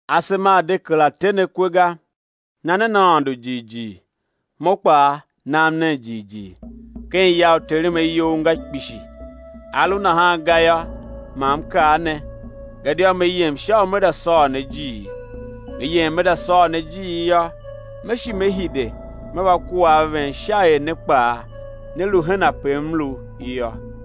Asema a̱ de kera te ne kwe ga; na nen Aôndo jighjigh, Mo kpaa nam nen jighjigh. Ken ya u Terem ayou nga kpishi; a lu nahan ga yô, ma M kaa ne; gadia Me yem sha u Me za sôr ne ijiir. Me yem Me za sôr ne ijiir yô, Me shi Me hide, Me va kua a ven sha er ne kpaa né lu hen ape M lu yô.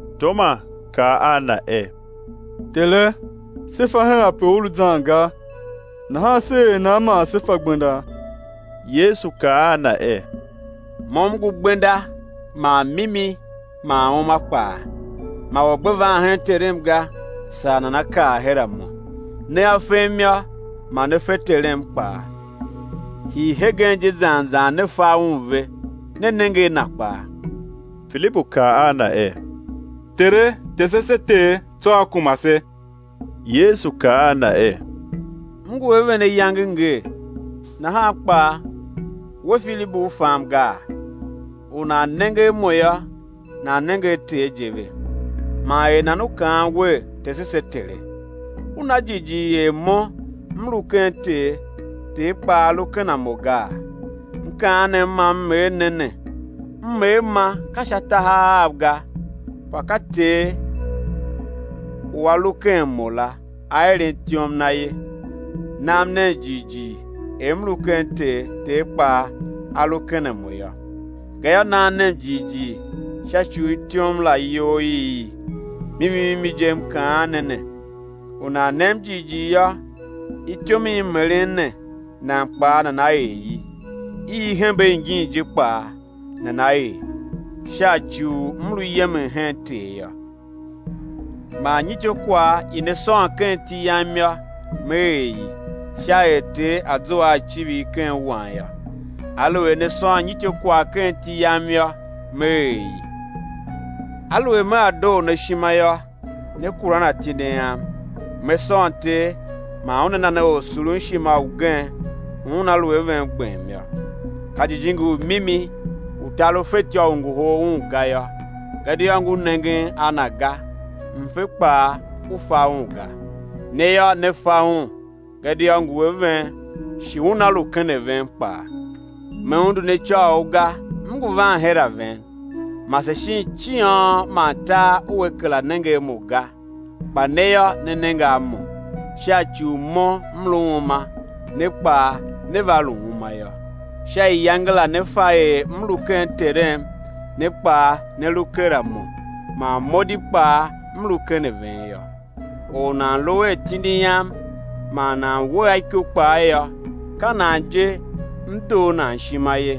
Toma kaa a Na er: Tere, se fa hen ape U lu zan ga, nahan sé er nan man sé fa gbenda? Yesu kaa a na er: Mo M ngu gbenda man mimi man uma kpaa. Ma or gbe van hen Terem ga, saa nana kar her a Mo. Nea fem yô, ma ne fe Terem kpaa; hii hegen je zan zan ne fa Un ve, ne nenge a Na kpaa. Filibu kaa a Na er: Tere, tese se Ter, tsô á kuma se. Yesu kaa a na er; M ngu a ven ayange ngee, nahan kpaa, we Filibu, u fam gaa? U nan nenge a Mo yô, nan nenge a Ter je ve; man er nan u kaan wer: Tese se Tere? U na jighjigh er Mo M lu ken Ter, Ter kpaa A lu ken a Mo gaa? Mkaanem ma M er ne ne, M er ma ka sha tahav av ga kpa ka Ter u A lu ken Mo la, A eren ityom Na ye. Nam nen jighjigh er M lu ken Ter, Ter kpaa A lu ken a Mo yô; gayô, nam nen jighjigh sha ci u ityom la iyol i i. Mimi mimi je, M kaan ne ne, u nan nem jighjigh yô, ityom i M eren ne, nan kpaa nana er i; i i hembe ingin je kpaa nana er, sha ci u M lu yemen hen Ter yô. Man nyityô kwagh i ne sôn ken iti Yam yô, Me er i, sha er Ter A̱ zua a icivir ken Wan yô. Aluer ne sôn nyityô kwagh ken iti Yam yô, Me er i. Aluer Mea doo ne ishima yô, né kuran atindi Am. Me sôn Ter, man Una na ne Orsurunshima ugen u Una lu a ven gbem yô, ka Jijingi u mimi u tar u fetyô u ngohol Un ga yô, gadia ngu nengen a Na ga, mfe kpaa u fa Un ga; ne yô, ne fa Un, gadia ngu a ven, shi Una lu ken a ven kpaa. Me undu ne icôghol ga, M ngu van her a ven. Mase shin ciôn man tar ua kera nenge a Mo ga; kpa ne yô, né nenge a Mo, sha ci u Mo M lu uma, ne kpaa né va lu uma yô. Sha iyange la né fa er M lu ken Terem ne kpaa ne lu ker a Mo, man Mo di kpaa M lu ken a ven yô. Or u nan lu a atindi Am, man nan we a iko kpaa yô, ka nan je, M doo nan ishima ye.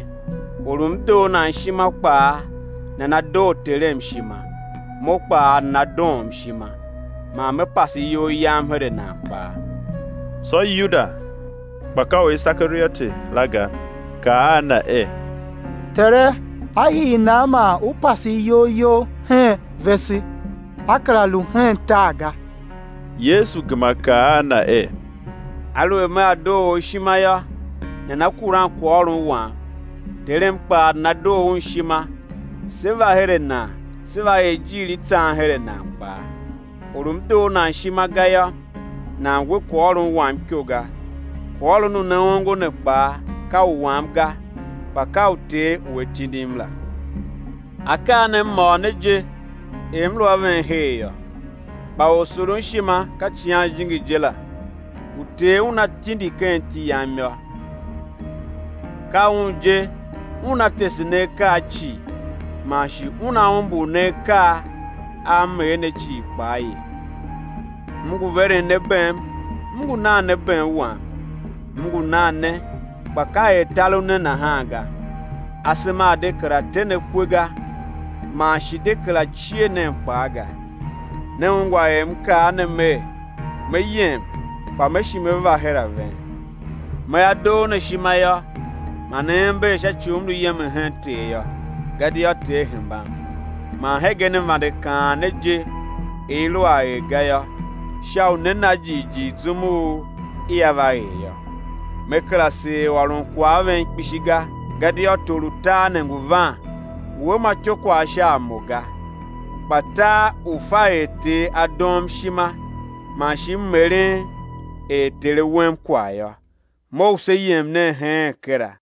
Or u M doo nan ishima kpaa, nana doo Terem ishima; Mo kpaa nana doom ishima, man Me pase iyol Yam her a nan kpaa. Tsô Yuda, kpa ka u Isekarioti la ga, kaa a Na er: Tere á hii nan man ú pase iyol You hen vese, á kera lu hen tar ga? Yesu gema kaa a na er: Aluer Mea doo or ishima yô, nana kuran kwaghôron Wam, Terem kpaa nana doo Un ishima; Sé va her a nan Sé va er ijiir i tsan her a nan kpaa. Or u M doo nan ishima ga yô, nan we kwaghôron Wam iko ga; kwaghôron u ne ongo ne kpaa, ka u Wam ga, kpa ka u Ter u A tindim la. Akaa ne M ôr ne je, er M lu a ven her yô. Kpa Orsurunshima, ka Icighan Jijingi je la, u Ter Una tindi ken iti Yam yô, ka Un je, Una tese ne akaa cii, man shi Una umbur ne akaa a M er ne cii kpaa ye. M ngu veren ne bem, M ngu nan ne bem Wam; M ngu nan ne, kpa ka er tar u ne nahan ga. Asema a̱ de kera te ne kwe ga, man shi de kera cie nen kpaa ga. Ne ungwa er M kaa ne Mer, Me yem kpa Me shi Me va her a ven. Mea doo ne ishima yô, ma ne ember sha ci u M lu yemen hen Ter yô; gadia Ter hembam. Man hegen M vande kaan ne je, er i lu a er ga yô, sha u né na jighjigh zum u ia va er yô. Me kera seer ôron kwagh a ven kpishi ga; gadia tor u tar ne ngu van, ngu a ma ityôkwagh sha a Mo ga, kpa tar u̱ fa er Ter A doom ishima, man shi M eren er Ter A wem kwagh yô. Mough se yem nen heen kera.